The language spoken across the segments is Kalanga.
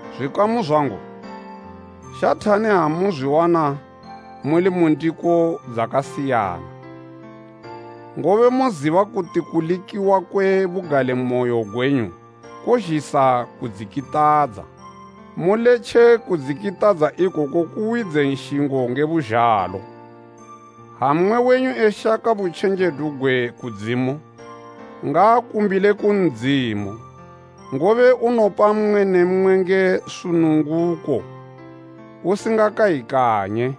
Zwikamu zwangu, shathani ha muzwiwana muli mu ndiko dzakasiyana. Ngobe moziba kuti kulikiwa kwe bugalimoyo gwenyu kozhisa kudzikitadza. Muletje kudzikitadza ikoku kuwidze nshingo nge buzhalo. Ha mmwe wenyu eshaka butjenjedu gwe kudzimu, ngaakumbile ku Ndzimu, ngobe unopa mmwe ne mmwe nge sununguko usingakayikanye.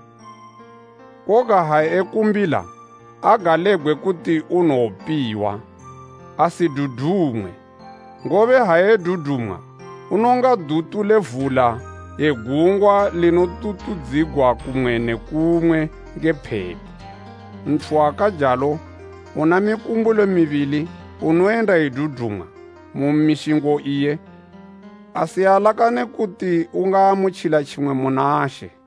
Koga ha ekumbila agalebgwe kuti unowopiwa, asidudumwe, ngobe ha edudumwa, unonga duthu le vula ye gungwa linotutudzigwa kumwe ne kumwe nge phepo. Nthu wakajalo, una mikumbulo mibili, unoyenda edudumwa mu mishingo iye, asialakane kuti ungaamutjila tjimwe muna She.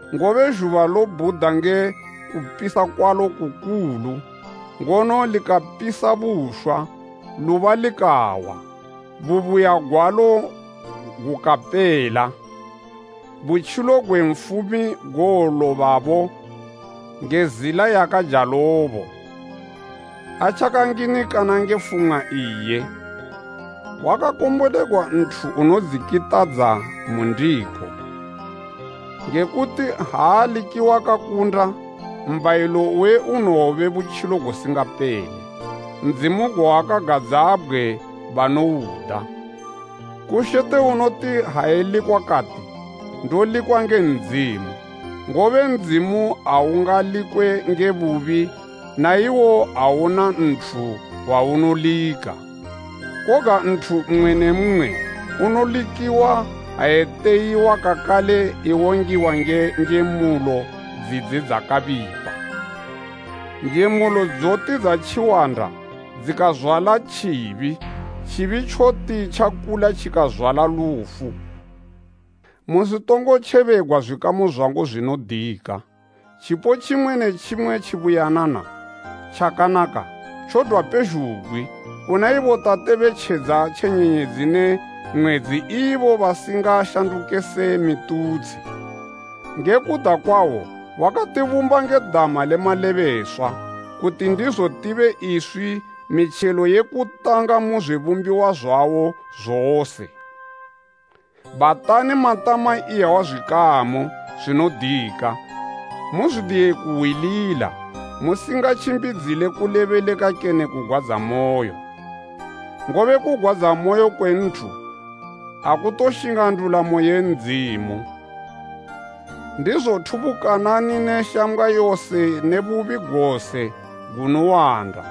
ngobe zhuba lobhuda nge kupisa kwalo kukulu, ngono likapisa bushwa, luba likawa, bubuya gwalo gukapela. Butjilo gwe nfumi gowolobabo nge zila yakajalobo, atjakanginikana nge fumwa iye. Wakakombolegwa nthu unodzikitadza mu ndiko, nge kuti ha alikiwa kakunda, mbhayilo uwe unowobe butjilo gusingapele, Ndzimu gwawakagadzabgwe banouda. Kushete unoti ha elikwa kati, “Ndolikwa nge Ndzimu.” Ngobe Ndzimu aungalikwe nge bubi naiwo awuna nthu waunolika. Koga nthu mmwe ne mmwe unolikiwa ha eteyiwa kakale ewongiwa nge njemulo dzidze dzakabipa. Njemulo dzoti dzatjiwanda dzikazwala tjibi, tjibi tjoti tjakula tjikazwala lufu. Musitongotjebegwa zwikamu zwangu zwinodika. Tjipo tjimwe ne tjimwe tjibuyanana, tjakanaka, tjodwa pezhugwi, kuna ibo Tate be tjedza tje nyenyedzi ne mwedzi ibo basingashanduke se mitutshi. Nge kuda kwawo wakatibumba nge dama le malebeswa, kuti ndizo tibe iswi mitjelo yekutanga mu zwibumbiwa zwawo zose. Bhatani matama iyawa zwikamu zwinodika. Muzwidiye kuhwilila musingatjimbidzile kulebeleka kene kugwadzamoyo. Ngobe kugwadzamoyo kwe nthu akutoshinga ndulamo ye Ndzimu. Ndizo thubukanani ne shambgwa yose ne bubi gose gunowanda,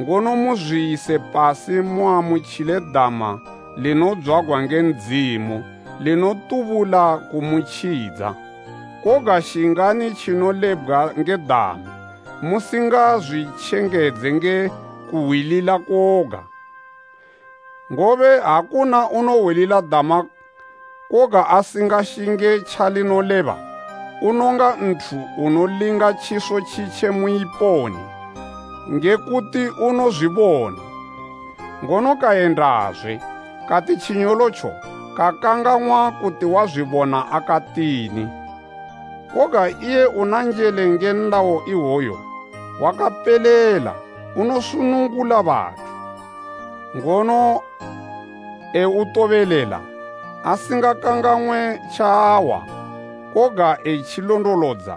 ngono muzwiyise pasi muamutjile dama linodzwagwa nge Ndzimu, linotubula kumutjidza. Koga shingani tjinolebgwa nge dama, musingazwitjengedze nge kuhwilila koga. Ngobe ha kuna unohwilila dama, koga asingashinge tjalinoleba, unonga nthu unolinga tjiso tjitje mu iponi, nge kuti unozwibona, ngono kayendazwe kati tjinyolotjo kakangang'wa kuti wazwibona akatini. Koga iye una njele nge nlayo iwo wakapelela unosunungula bathu, ngono eutobelela, asinga kangang'we tjaahwa koga etjilondolodza,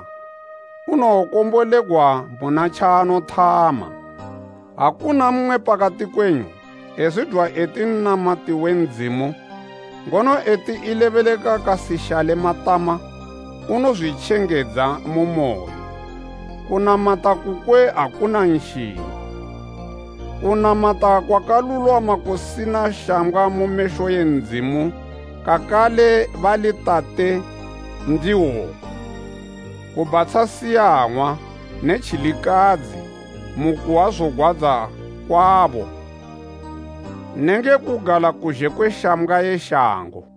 unowokombolegwa muna tjaanothama. Ha kuna mmwe pakati kwenyu ezwidwa eti nnamati we Ndzimu, ngono eti elebeleka kasishale matama, unozwitjengedza mu moyo, kunamata kukwe akuna nshingo. Kunamata kwakalulwama kusina shambgwa mu mesho e Ndzimu, kakale bali Tate, ndi woku: kubhatsha siyang'wa ne tjilikadzi mu kuhwa zogwadza kwabo nenge kugala kuzhe kwe shambgwa ye shango.